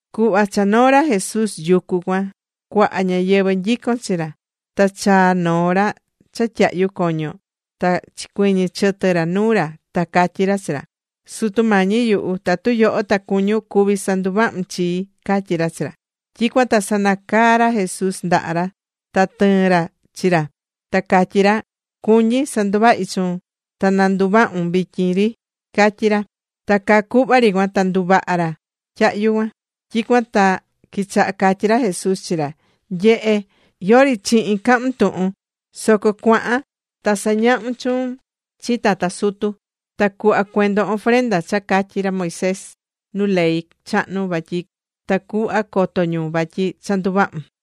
Cuhva cha noo̱ ra Jesús yucu cuan, cuaha ñáyɨvɨ nyicón chi ra. Ta chaa̱ noo ra cha tyahyú coño, ta chicuɨñɨ̱ chɨtɨ ra nuu ra, ta catyí ra chi ra: ―Sutu Mañi yuhu, tatu yoho ta cuñún, cuví sanduvahun chii ―catyí ra chi ra. Tyicuan ta sanacaa̱ ra Jesús ndaha ra ta tɨɨ̱n ra chi ra, ta catyí ra: ―Cuñí sanduvahi chuun. Ta na nduvahun vityin ri ―catyí ra. Ta caa cuhva ri cuan ta nduvaha̱ nu tyahyu̱ cuan. Tyicuan ta quichaha catyí ra Jesús chi ra: ―Nye̱he, yori chihin cahun tuhun. Soco cua̱han, ta sa̱ñahun chuun chi tata sutu, ta cu̱hva cuendon ofrenda cha catyi̱ ra Moisés nu ley chahnu vatyi tacuhva coto ñu vatyi cha nduvahu̱n.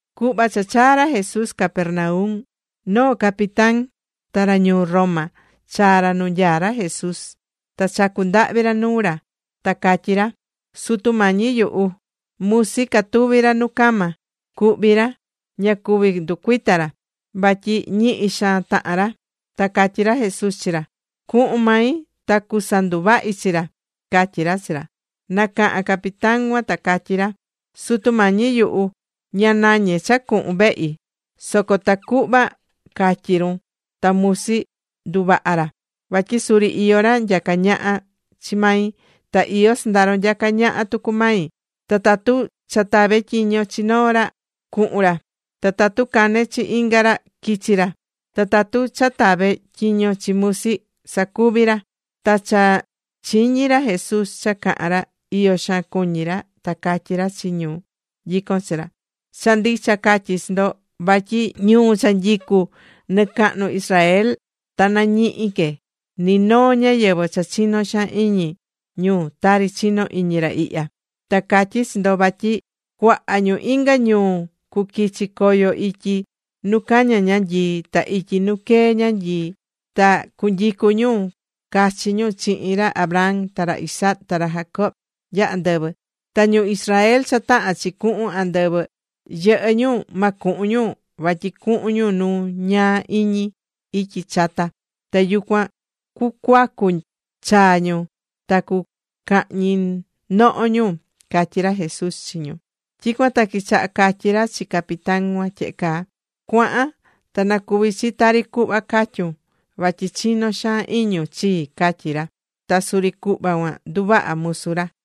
Cuhva cha chaa̱ ra Jesús Capernaum, noo capitán, ra ñuu Roma, chaa̱ ra nu nyaá ra Jesús ta chacu̱ ndahvi ra nuu ra, ta catyí ra: ―Sutu Mañi yuhu, musi catuví ra nu cama. Cuhví ra. Ña cuví nducuita ra vatyi ñihi xaan tahán ra. Ta catyí ra Jesús chi ra: ―Cuhun mai ta cusanduvahi chi ra ―catyí ra chi ra. Nacaha̱n capitán cuan ta catyí ra: ―Sutu Mañi yuhu, ña nañé cha cuhun vehi; soco tacuhva catyi run, ta musi nduvaha ra. Vatyi suri iyó ra nyacá ñaha chi mai. Ta iyó sɨndaro nyacá ñaha tucu mai. Ta tatu cha tave tyiño chi noo ra, cuhun ra. Ta tatu cane chi inga ra, quichi ra. Ta tatu cha tave tyiño chi musi, sacuvi ra. Ta cha chiñi̱ ra Jesús cha caha̱n ra, iyo xaan cuñi̱ ra. Ta catyí ra chi ñu nyicón chi ra: ―Cha ndicha catyí chi ndo, vatyi ñuu cha nyicú nicahnu Israel, ta nañihi que ni noo ñáyɨvɨ cha chinó xaan iñi ñu tari chinó iñi ra ihya. Ta catyí chi ndo vatyi cuaha ñu inga ñuu cuquichi coyo ityi nu caña ñanyii, ta ityi nu quee ñanyii, ta cunyicu ñu cachi ñu chihin ra Abraham ta ra Isaac ta ra Jacob nya andɨvɨ. Ta ñu Israel cha tahán chi cuhun andɨvɨ, yɨhɨ́ ñu, ma cuhun ñu, vatyi cuhun ñu nu ñaa iñi ityi chata. Ta yucuan cucuacu chaa ñu ta cucahñi noho ñu ―catyí ra Jesús chi ñu. Tyicuan ta quichaha catyí ra chi capitán cuan tyehe caa: ―Cua̱han, ta na cuvi chi tari cuhva catyu̱n vatyi chinó xaan iñun chii ―catyí ra. Ta suri cuhva cuan nduvaha̱ musu ra.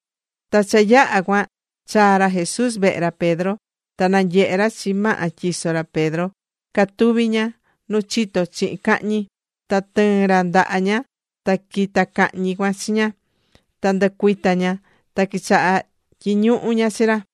Ta cha yaha̱ cuan, chaa̱ ra Jesús vehe ra Pedro. Ta nanyehe̱ ra chi maha tyiso ra Pedro, catuví ña nu chito chihin cahñi. Ta tɨɨ̱n ra ndaha ña, ta quita̱ cahñi cuan chi ña. Ta ndɨcuita̱ ña, ta quichaha̱ tyiñuhu ña chi ra.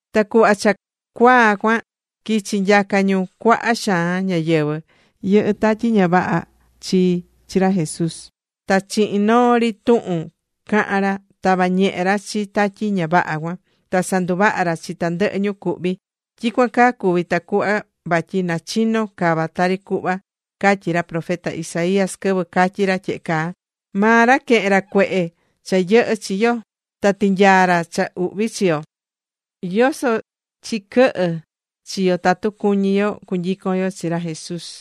Ta cuhva cha cuaa cuan, quichi̱ nyaca ñu cuaha xaan ñáyɨvɨ yɨhɨ́ tatyi ña vaha chi chi ra Jesús. Ta chihin noo ri tuhun caha̱n ra, tava̱ ñehe ra chi tatyi ña vaha cuan, ta sanduvaha̱ ra chi tandɨhɨ ñu cuhví. Tyicuan caa cuvi̱ tacuhva vatyi na chino cava tari cuhva catyi̱ ra profeta Isaías, quɨvɨ catyi̱ ra tyehe caa: “Maa ra quehe̱n ra cuehe cha yɨhɨ́ chi yo, ta tinyaa̱ ra cha uhvi chi yo.” ¿Yoso chiquɨhɨ́ chi yo tatu cuñí yo cunyicon yo chi ra Jesús?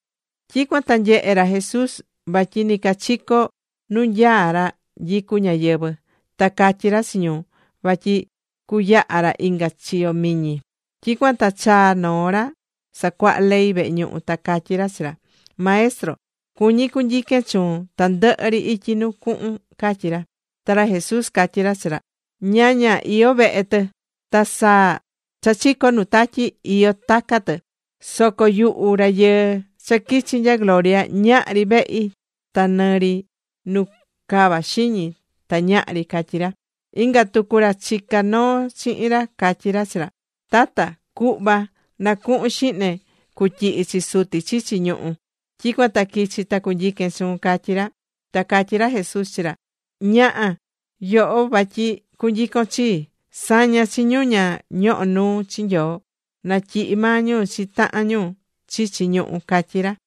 Tyicuan ta nyehe̱ ra Jesús vatyi nicachico nu nyaá ra nyicú ñáyɨvɨ. Ta catyi̱ ra chi ñu vatyi cuyaha ra inga chiyo miñi. Tyicuan ta chaa̱ noo ra sacuaha ley vehe ñuhu ta catyí ra chi ra: ―Maestro, cuñí cunyiquen chuun tandɨhɨ ri ityi nu cuhun ―catyí ra. Ta ra Jesús catyí ra chi ra: ―Ñaña, iyó vehe tɨ, ta saa cha chicó nu tatyi, iyó taca tɨ. Soco yuhu Rayɨɨ cha quichi̱ nya gloria, ñahri vehi ta nɨ ri nu cava xiñi ta ñahri ―catyí ra. Inga tucu ra chicá noo chihin ra catyí ra chi ra: ―Tata, cu̱hva na cuhun xihne cutyihi chi suti chichi ñuhú, tyicuan ta quichi ta cunyiquen chuun ―catyí ra. Ta catyí ra Jesús chi ra: ―Ña̱ha yoho vatyi cunyicon chii. Sa̱ña chi ñu ña ñohó nuu chi Nyoo, na tyihi maa ñu chi tahan ñu chichi ñuhú ―catyí ra.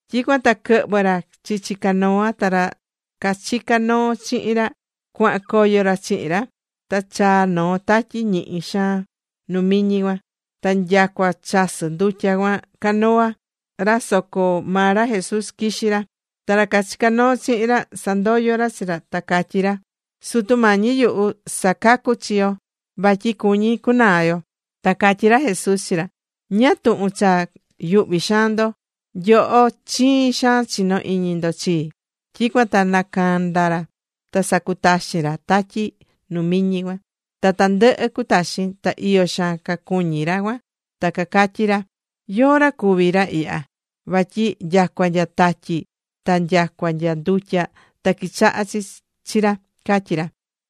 Tyicuan ta quɨhvɨ̱ ra chichi canoa, ta ra cachicá noo chihin ra, cuahan coyo ra chihin ra. Ta chaa̱ noo tatyi ñihi xaan nu miñi cuan, ta nyacua chasɨ́ ndutya cuan canoa ra soco maa ra Jesús quixí ra. Ta ra cachicá noo chihin ra sandoyo̱ ra chi ra, ta cacatyí ra: ―¡Sutu Mañi yuhu, sa̱cacu chi yo, vatyi cuñí cunaa yo! Ta catyí ra Jesús chi ra: ―¿Ñáá tuhun cha yuhví xaan ndo? ¡Nyoho chiin xaan chinó iñi ndo chii! Tyicuan ta nacanda̱ ra ta sacutaxi̱n ra tatyi nu miñi cuan, ta tandɨhɨ cutaxi̱n. Ta iyo xaan cacuñí ra cuan ta cacatyí ra: ―¿Yóó ra cuví ra ihya? Vatyi nyacua nya tatyi ta nyacua nya ndutya ta quichahá chi ra ―catyí ra.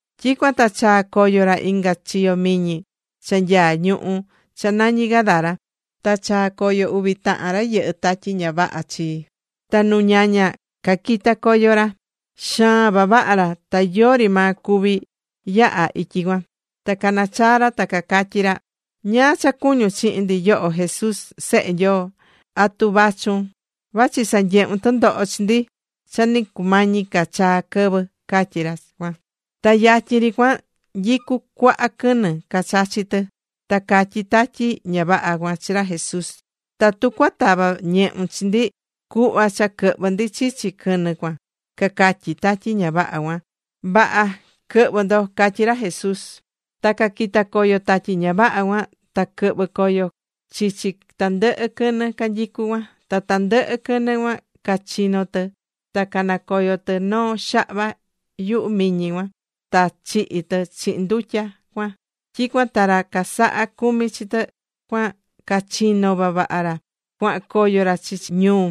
Tyicuan ta chaa̱ coyo ra inga chiyo miñi cha nyaá ñuhú cha nañí Gadara. Ta chaa̱ coyo uvi tahan ra yɨhɨ́ tatyi ña vaha chii. Ta nu ñaña caquita̱ coyo ra cuan. Xaan vavaha ra, ta yori maa cuví yaha ityi cuan. Ta canachaá ra, ta cacatyí ra: ―¿Ñáá cha cuñún chihin ndi, yoho Jesús Sehe Nyoo? ¿Atu vachun vachi sanyehun tɨndoho chi ndi cha ni cumañi ca chaa quɨvɨ? ―cacatyí ra cuan. Ta yatyin ri cuan nyicú cuaha quɨnɨ cachachí tɨ. Ta catyí tatyi ña vaha cuan chi ra Jesús: ―Tatu cuatava ñehun chi ndi, cu̱hva cha quɨhvɨ ndi chichi quɨnɨ cuan ―cacatyí tatyi ña vaha cuan. ―Vaha. Quɨ̱hvɨ ndo ―catyí ra Jesús. Ta caquita̱ coyo tatyi ña vaha cuan, ta quɨhvɨ coyo chichi tandɨhɨ quɨnɨ canyicú cuan. Ta tandɨhɨ quɨnɨ cuan cachino̱ tɨ ta canacoyo tɨ noo xahva yuhu miñi cuan, ta chihi̱ tɨ chihin ndutya cuan. Tyicuan ta ra casaha̱ cumi chi tɨ cuan, cachinó vavaha ra cuahan coyo ra chichi ñuu,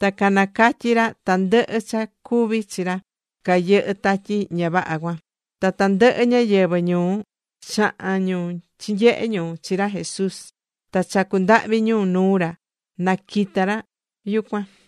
ta canacatyi̱ ra tandɨhɨ cha cuvi̱ chi ra cayɨhɨ̱ tatyi ña vaha cuan chi. Ta tandɨhɨ ñáyɨvɨ ñuu, chaha̱n ñu chinyehe̱ ñu chi ra Jesús, ta chacu̱ ndahvi ñu nuu ra na quita ra yucuan.